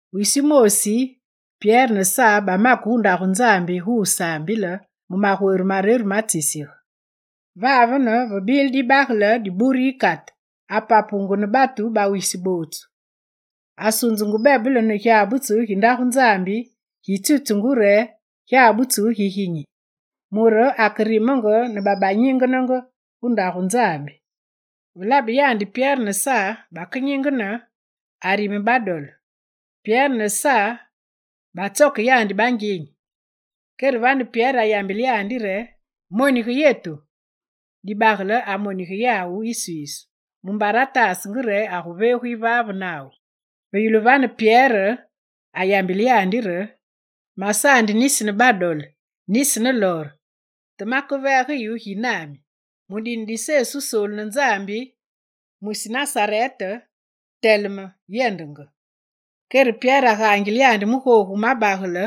Wisi wumoosi, Pyere ne Sa bamake gu ndagu Nzambi gu wusaambile mu magwere mareru matsisige. Vavene ve bile dibagele diburu yikate, apapungu ne batu bawisi bootsu. Asunzungu bebele ne gyabutsu gi Ndagu Nzambi, gi tsitsungu re Gyabutsu Giginyi, mure akerimenge ne babanyingenenge gu Ndagu Nzambi. Ve labe yandi re Pyere ne Sa bakenyingene, arime badole. Pyere ne Sa batsoke ya bangyenyi. Kere vane Pyere ayambile yandi re: «Monige yetu.» Dibagele amonige yawu iswiisu, mumbare ataasenge re aguveegu yivaave nawu. Ve yulu vane, Pyere ayambile yandi re: «Masaandi nisi ne badole, nisi ne lor, te makeveege yu gi nami: mu dine di Sesu Wusoolu ne Nzambi, mwisi Nasarete, teleme, yendenge!» Kere Pyere agaangile yandi mu googu wu mabagele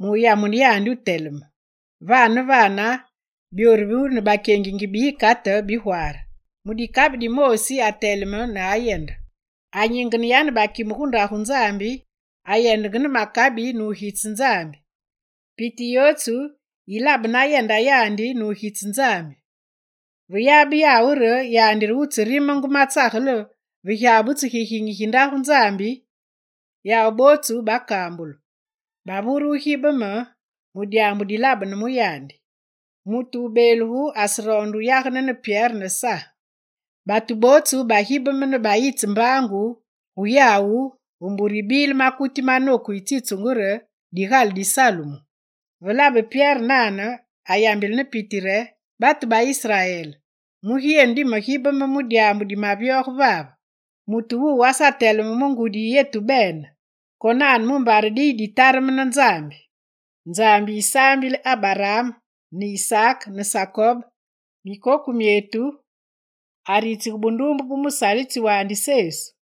muyamune yandi wuteleme. Vane ne vane byoru ne bakyengingi bi yikate bigwaare; mu dikabi dimoosi ateleme ne ayende. Anyingene yane bakime gu Ndagu Nzambi, ayendenge ne makabi nugitse Nzambi. Piti yootsu yilabe nayenda yandi nugitse Nzambi. Ve yabe yawu re yandi re wutserimenge matsagele ve Gyabutsu Giginyi gi Ndagu Nzambi, yawu bootsu bakambulu, bavure wugibeme mu dyaambu dilabene mu yandi. Mutu wubeelugu aseroonde wuyagene ne Pyere yane Sa. Batu bootsu bagibeme ne bayitse mbaangu gu yawu ve mbure yibile makuti manoku yitsitsungu re Digale di Salumu. Ve labe Pyere nane, ayambile ne piti re: «Batu ba Israel, mugi yenu dimagibeme mu dyaambu dimavyoge vave? Mutu wuwu asateleme mu ngudi yi yetu bene konane mumbare diyibatareme ne Nzambi. Nzambi yisaambile Abaraam ne Isaak ne Sakob, mikoku myetu, aritsige bunduumbe bu musalitsi wandi Sesu.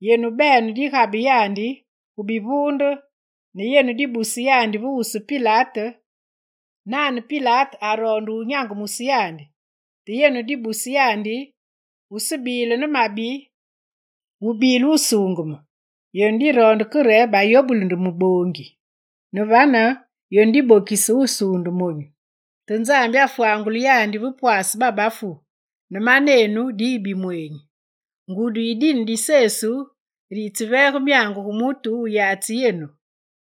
Yenu bene digabe yandi gu bivuunde ne yenu dibuse yandi ve wusu Pilate, nane Pilate aroonde wunyangumuse yandi. Te yenu dibuse yandi wusebile ne mabi, wubile Wusuungeme. Yenu diroonde ke re bayobuli nde muboongi. Ne vane yenu dibokise wusuunde monyu. Te Nzambi afwangule yandi ve pwaase bafuumbi ne manenu diyi bimweenyi. Ngudi yi dine di Sesu re yitseveege myangu gu mutu wuyatsi yenu,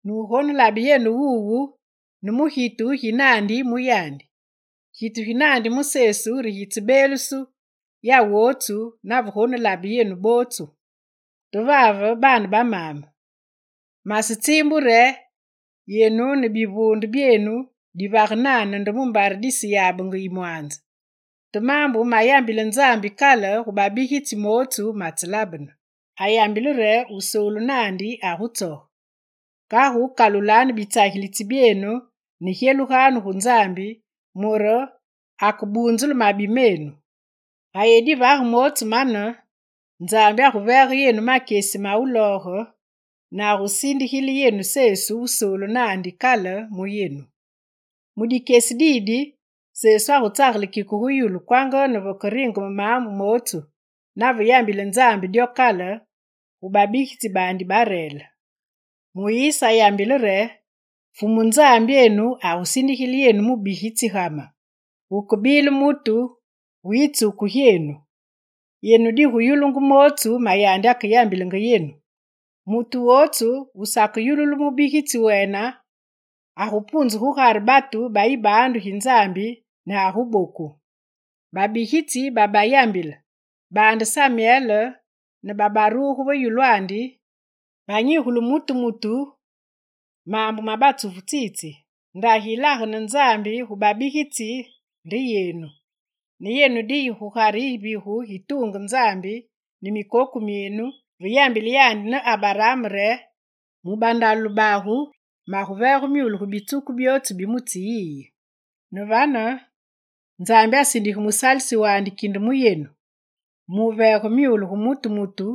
nugonelabe yenu wuwu ne mu gitu gi naandi mu yandi. Gitu ginandi mu Sesu re gitsebeeluse yawootsu nave gonelabe yenu bootsu. Te vave, baane ba maame, masetsiimbu re yenu ne bivuunde byenu divage nane nde mumbare diseyabenge yimwanze. Te maambu mayambile Nzambi kale gu babigitsi bootsu matselabene; ayambile re Wusoolu naandi agutsoge. Kagu kalulanu bitsagilitsi byenu ne gyelugwanu gu Nzambi mure akebunzule mabi menu. Ga yenu divage mootsu mane, Nzambi aguveege yenu makyesi ma wulooge ne agusindigile yenu Sesu Wusoolu naandi kale mu yenu. Mu dikyesi didi, Sesu agutsagele kike gu yulu kwanga ne vekeberingeme maambu mootsu, nave yambile Nzambi dyo kale gu babigitsi baandi bareele. Muyise ayambile re: “Fumu Nzambyenu agusindigile yenu mubigitsi ga me, wukebile mutu wu yitsuku gyenu. Yenu diguyulungu mootsu ma yandi akeyambilenge yenu. Mutu wootsu wusakeyululu mubigitsi wene agupunzu gugare batu ba yibaandu gi Nzambi ne aguboku.” Babigitsi babayambile, baande Samyel ne babaruge va yulwandi, banyigule mutu mutu maambu ma batsufu tsitsi. Ndagi yilagene Nzambi gu babigitsi nde yenu. Ne yenu diyi gugare yivigu gituunge Nzambi ne mikoku myenu ve yambile yandi ne Abaraam re: “Mu bandalule bagu, maguveege myule gu bitsuku byootsu bi mutsi yi.” Ne vane, Nzambi asindige musalitsi wandi kinde mu yenu, muveege myule gu mutu mutu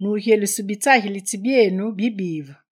nugyeluse bitsagilitsi byenu bibive.»